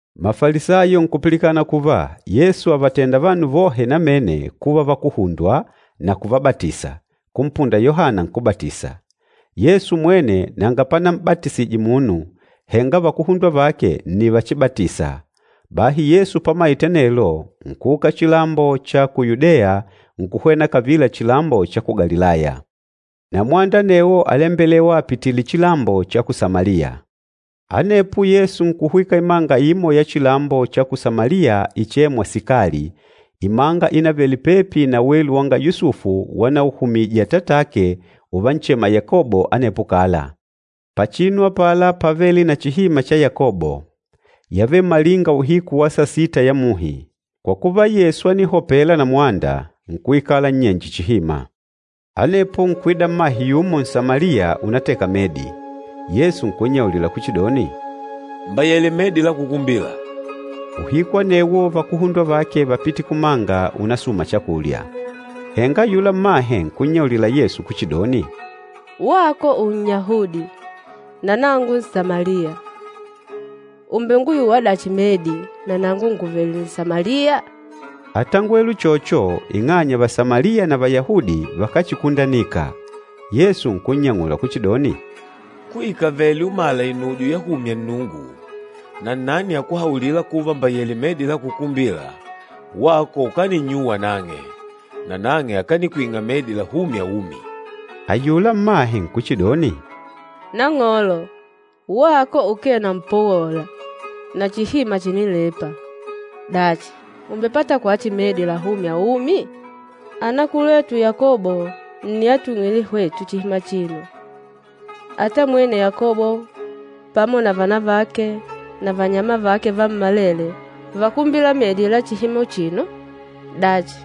Mafalisayo nkupilikana kuva Yesu àvatenda vanu vohe namene kuva vakuhundwa na kuvabatisa, kumpunda Yohana Nkúbatisa. Yesu mwene nanga panam'batisije munu, henga vakuhundwa vake nni vachibatisa. Bahi Yesu pamaite anelo, nkuuka chilambo cha ku Yudeya nkuhwena kavila chilambo cha ku Galilaya, na mwanda anewo álembelewa apitììle chilambo cha ku Samaliya. Anepo Yesu nkuhwika imanga imo ya chilambo cha ku Samaliya ichêmwa Sikali, imanga ínavele pepi na welu wanga Yusufu wanauhumije atatake uvanchema Yakobo anepo kala. Pachinu apala pávele na chihima cha Yakobo. Yávele malinga uhiku wa sasita ya muhi. Kwa kuva, Yesu ánihopela na mwanda, nkuikala nnyenje chihima. Anepo nkuida mmahe yumo Nsamaliya unateka medi. Yesu nkunnyaulila kuchidoni, “Mbayele medi la kukumbila.” Uhiku anewo vakuhundwa vake vápite kumanga unasùmà chakulya. Henga ayula mmahe nkunnyaulila Yesu kuchidoni, “Wako Unnyahudi na nangu Nsamaliya! Ùmbenguyuwa dachi medi na nangu ngùvele Nsamaliya?” Átangwele uchocho ing'anya Vasamaliya na Vayahudi vakáchikundanika. Yesu nkunnyang'ula kuchidoni, “Kuikavele umàlà inujo yahumya Nnungu, na nnani akuhaulîla kuva mbayele medi la kukumbila, wako ukaninnyuwa nang'e, nanang'e akanikwing'a medi lahûmya umi.” Ayula mmahe nkuchidoni, “Nang'olo, wako ukee na mpowola, na chihima chìnilepa, dachi ùmbepata kwachi medi lahûmya umi? Anakulwetu Yakobo nni atwing'île hwetu chihima achino, ata mwene Yakobo pamo na vana vake na vannyama vake vammalele vákumbila medi la chihima uchino. Dachi,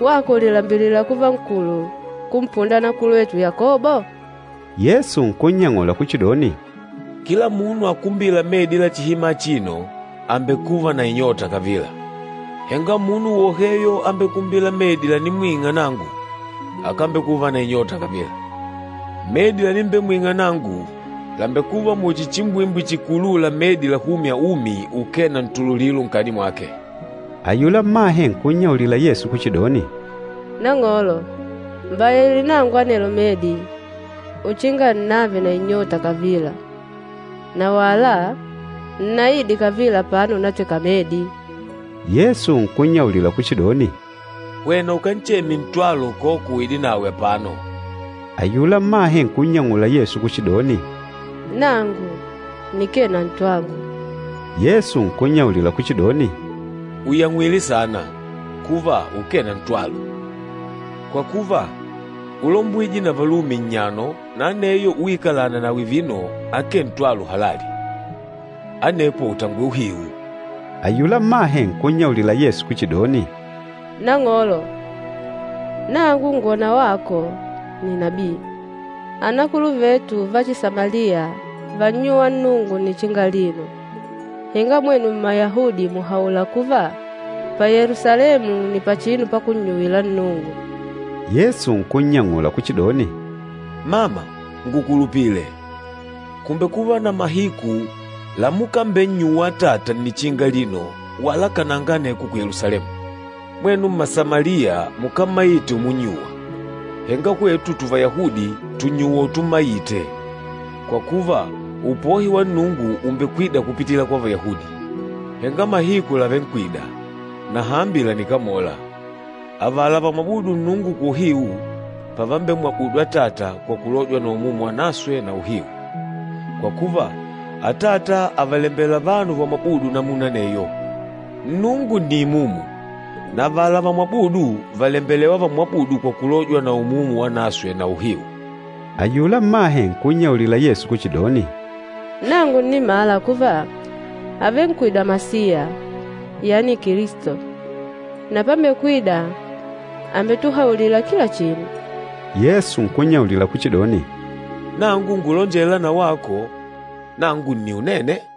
wako ùlilambilila kuva nkulu kumpunda anakulwetu Yakobo?” Yesu nkunnyang'ula kuchidoni, “Kila munu akumbîla medi la chihima achino, àmbekuva na inyota kavila. Henga munu woheyo ambekumbîla medi lanimbemwing'a nangu, akambekuva na inyota kavila. Medi lanimbemwing'a nangu làmbekuva muchi chimbwimbwi chikulûla medi lahûmya umi ukee na ntululilo nkati mwake.” Ayula mmahe nkunnyaulila Yesu kuchidoni, “Nang'olo, mbayele nangu anelo medi uchinga nnave na inyota kavila na wala nnaide kavila apano unateka medi.” Yesu nkunnyaulila kuchidoni, “Hwena ukancheme ntwalo koka uide nawe apano.” Ayula mmahe nkunnyang'ula Yesu kuchidoni, “Nangu nikee na ntwangu.” Yesu nkunnyaulila kuchidoni, “Ùyangw'ile saana, kuva ukee na ntwalo. Kwa kuva, úlombwije na valume nnyano na aneyo uikalâna nawe vino akee ntwalo halali, anepo ùtangwele uhiu.” Ayula mmahe nkunnyaulila Yesu kuchidoni, “Nang'olo, nangu ngwòna wako nni nabii. Anakuluvetu Vachisamaliya vánnyuwa Nnungu nnichinga alino, henga mwenu Mmayahudi mùhaula kuva, pa Yelusalemu nni pachinu pakunnyuwila Nnungu.” Yesu nkunnyang'ula kuchidoni, “Mama, ngukulupile, kùmbekuva na mahiku lamukambennyuwa Atata nnichinga alino wala kananga aneko ku Yelusalemu. Mwenu Mmasamaliya, mukámmaite umunnyuwa, henga hwetu tuvayahudi tùnnyuwa utummaite, kwa kuva upohi wa Nnungu ùmbekwida kupitila kwa Vayahudi. Henga mahiku làvenkwida, na hambi lànikamola, avala vamwabûdu Nnungu kwa uhiu, pavambemwabudu Atata kwa kulojwa na Umumu Wanaswe na uhiu. Kwa kuva, Atata àvalembela vanu vamwabûdu namuna aneyo. Nnungu nni imumu, na avala vamwabûdu vàlembelewa vamwabùùdu kwa kulojwa na Umumu Wanaswe na uhiu.” Ayula mmahe nkunnyaulila Yesu kuchidoni, “Nangu ǹnimala kuva, àvenkwida Masiya, yani Kilisto. Na pambekwida àmbetuhaulila kila chinu.” Yesu nkunnyaulila kuchidoni, “Nangu ngulonjêla na wako, ‘Nangu nni Unene.’”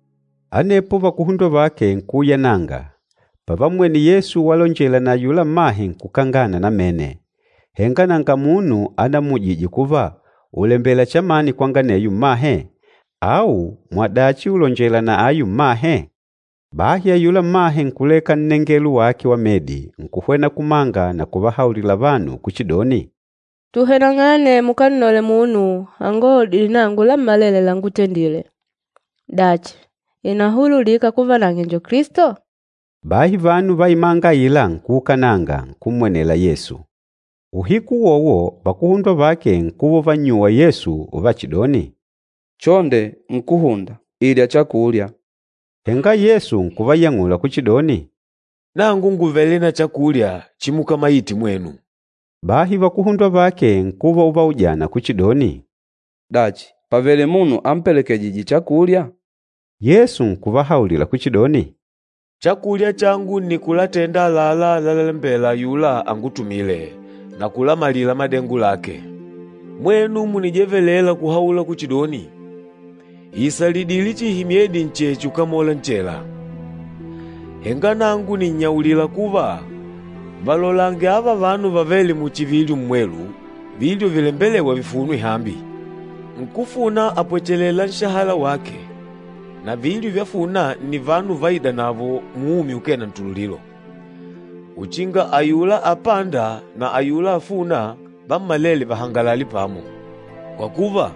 Anepo vakuhundwa vake nkuuyananga, pavammwene Yesu walonjela na ayula mmahe nkukangana namene. Henga nanga munu anammujije kuva, “Ùlembela chamani kwanga aneyo mmahe?” au, “Mwadachi ùlonjela na ayu mmahe?” Bahi ayula mmahe nkuleka nnengelo wake wa medi, nkuhwena kumanga na kuvahaulila vanu kuchidoni, “Tuhweneng'ane mukannole munu anguhaulidîle nangu lammalele langútendîle! Dachi, ìnahululika kuva nang'e njo Kilisto?” Bahi vanu va imanga aila nkuukananga, nkummwenela Yesu. Uhiku uwowo vakuhundwa vake nkuva uvannyuwa Yesu uvachidoni, “Chonde Nkúhunda, ilya chakulya.” Henga Yesu nkuvayang'ula kuchidoni, “Nangu ngùvele na chakulya chimukamaite mwenu.” Bahi vakuhundwa vake nkuva uvaujana kuchidoni, “Dachi, pàvele munu ampelekejîje chakulya?” Yesu nkuvahaulila kuchidoni, “Chakulya changu nni kulatenda àlalá lalalembela ayula angutumîle na kulamalila madengo lake. Mwenu mùnijevelela kuhaula kuchidoni, ‘Ìisalidile chihi myedi ncheche ukamole nchela!’ Henga nangu nìnnyaulila kuva, valolange ava vanu, vàvele muchi vilyo mmwelu, vilyo vilembelêwa vifunwe hambi. Nkúfuna àpwechelela nshahala wake, na vilyo vyafuna nni vanu vaidanavo muumi ukee na ntululilo, uchinga ayula apânda na ayula afûna vammalele vahangalale pamo. Kwa kuva,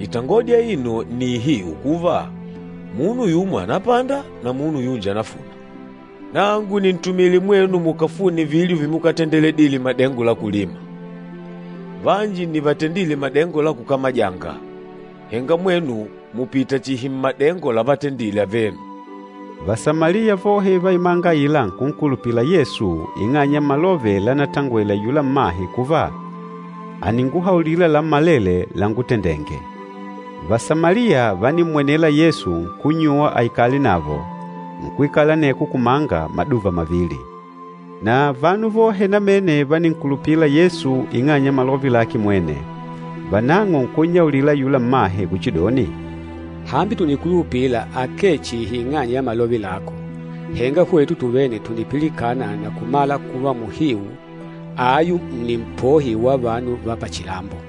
itangodi aino nni ihiu kuva, ‘Munu yumo ànapanda na munu yunji ànafuna.’ Nangu nìntumile mwenu mukafune vilyo vimukatendedile madengo la kulima, vanji nni vatendîle madengo la kukamajanga, henga mwenu mùpita chihi mmadengo lavatendile avenu.” Vasamaliya vohe va imanga aila nkunkulupila Yesu ing'anya ya malove lanatongwele ayula mmahe kuva, “Àninguhaulila lammalele langutendenge.” Vasamaliya vánimmwenela Yesu nkunnyuwa aikale navo, nkwikala aneko kumanga maduva mavili. Na vanu vohe namene váninkulupila Yesu ing'anya ya malove lake mwene. Vanang'o nkunnyaulila ayula mmahe kuchidoni, “Hambi tùnikulupila akee chihi ing'anya ya malove lako, henga hwetu tuvene tùnipilikana na kumala kuva muhiu ayu nni Mpohi wa vanu va pachilambo.”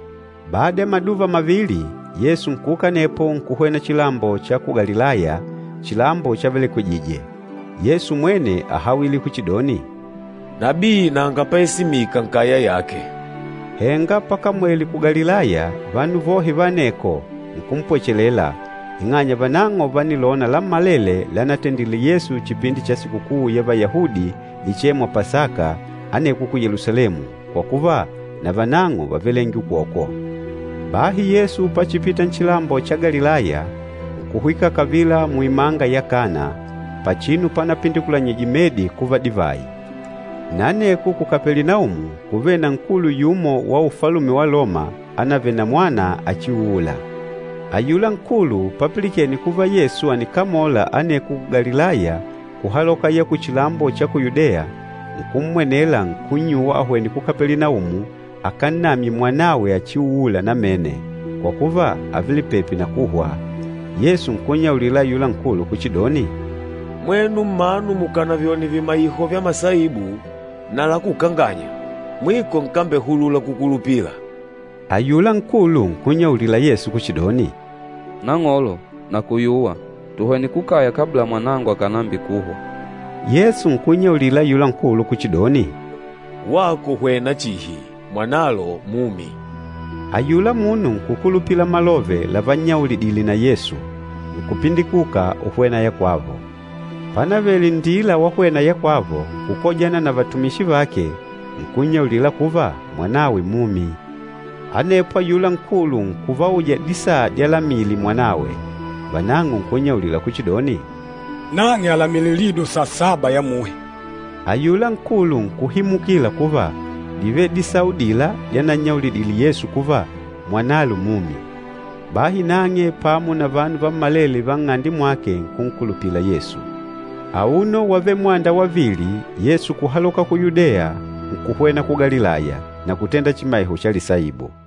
Bada ya maduva mavili, Yesu nkuuka anepo nkuhwena chilambo cha ku Galilaya, chilambo chavelekwejije. Yesu mwene áhawile kuchidoni, “Nabii nanga paesimika nkaya yake.” Henga pakamwele ku Galilaya, vanu vohe va aneko, nkumpwechelela, ing'anya vanang'o vánilona lammalele lanatendile Yesu chipindi cha sikukuu ya Vayahudi ichêmwa Pasaka aneko ku Yelusalemu, kwa kuva na vanang'o vávelenge ukokwo. Bahi Yesu pachipita nchilambo cha Galilaya, nkuhwika kavila muimanga ya Kana, pachinu panapindikulanyije medi kuva divayi. Na aneko ku Kapelinaumu kúvele na nkulu yumo wa ufalume wa Loma ánavele na mwana achiuula. Ayula nkulu papilikene kuva Yesu ànikamola aneko ku Galilaya kuhaloka ya kuchilambo cha ku Yudeya, nkummwenela nkunnyuwa ahwene ku Kapelinaumu akannamye mwanawe achiuula namene, kwa kuva ávele pepi na kuhwa. Yesu nkunnyaulila ayula nkulu kuchidoni, “Mwenu mmanu mukànavyone vimaiho vya masaibu na lakukanganya, mwiko nkambehulula kukulupila!” Ayula nkulu nkunnyaulila Yesu kuchidoni, “Nang'olo, nakuyuwa, tuhwene kukaya kabla mwanangu akànambikuhwa.” Yesu nkunnyaulila ayula nkulu kuchidoni, “Wako hwena chihi mwanalo mumi.” Ayula munu nkùkulupila malove lavannyaulidile na Yesu, nkupindikuka uhwena ya kwavo. Pánavele nndila wahwena ya kwavo, nkukojana na vatumishi vake, nkunnyaulila kuva, mwanawe mumi. Anepo ayula nkulu nkuvauja disaa dyalamile mwanawe. Vanang'o nkunnyaulila kuchidoni, “Nang'e àlamile lido sasaba ya muhi.” Ayula nkulu nkuhimukila kuva, dívele disaa udila dyanannyaulidile Yesu kuva, “Mwanalo mumi.” Bahi nang'e pamo na vanu vammalele va nng'ande mwake nkunkulupila Yesu. Auno wávele mwanda wavili, Yesu kuhaloka ku Yudeya nkuhwena ku Galilaya, na kutenda chimaiho cha lisaibu.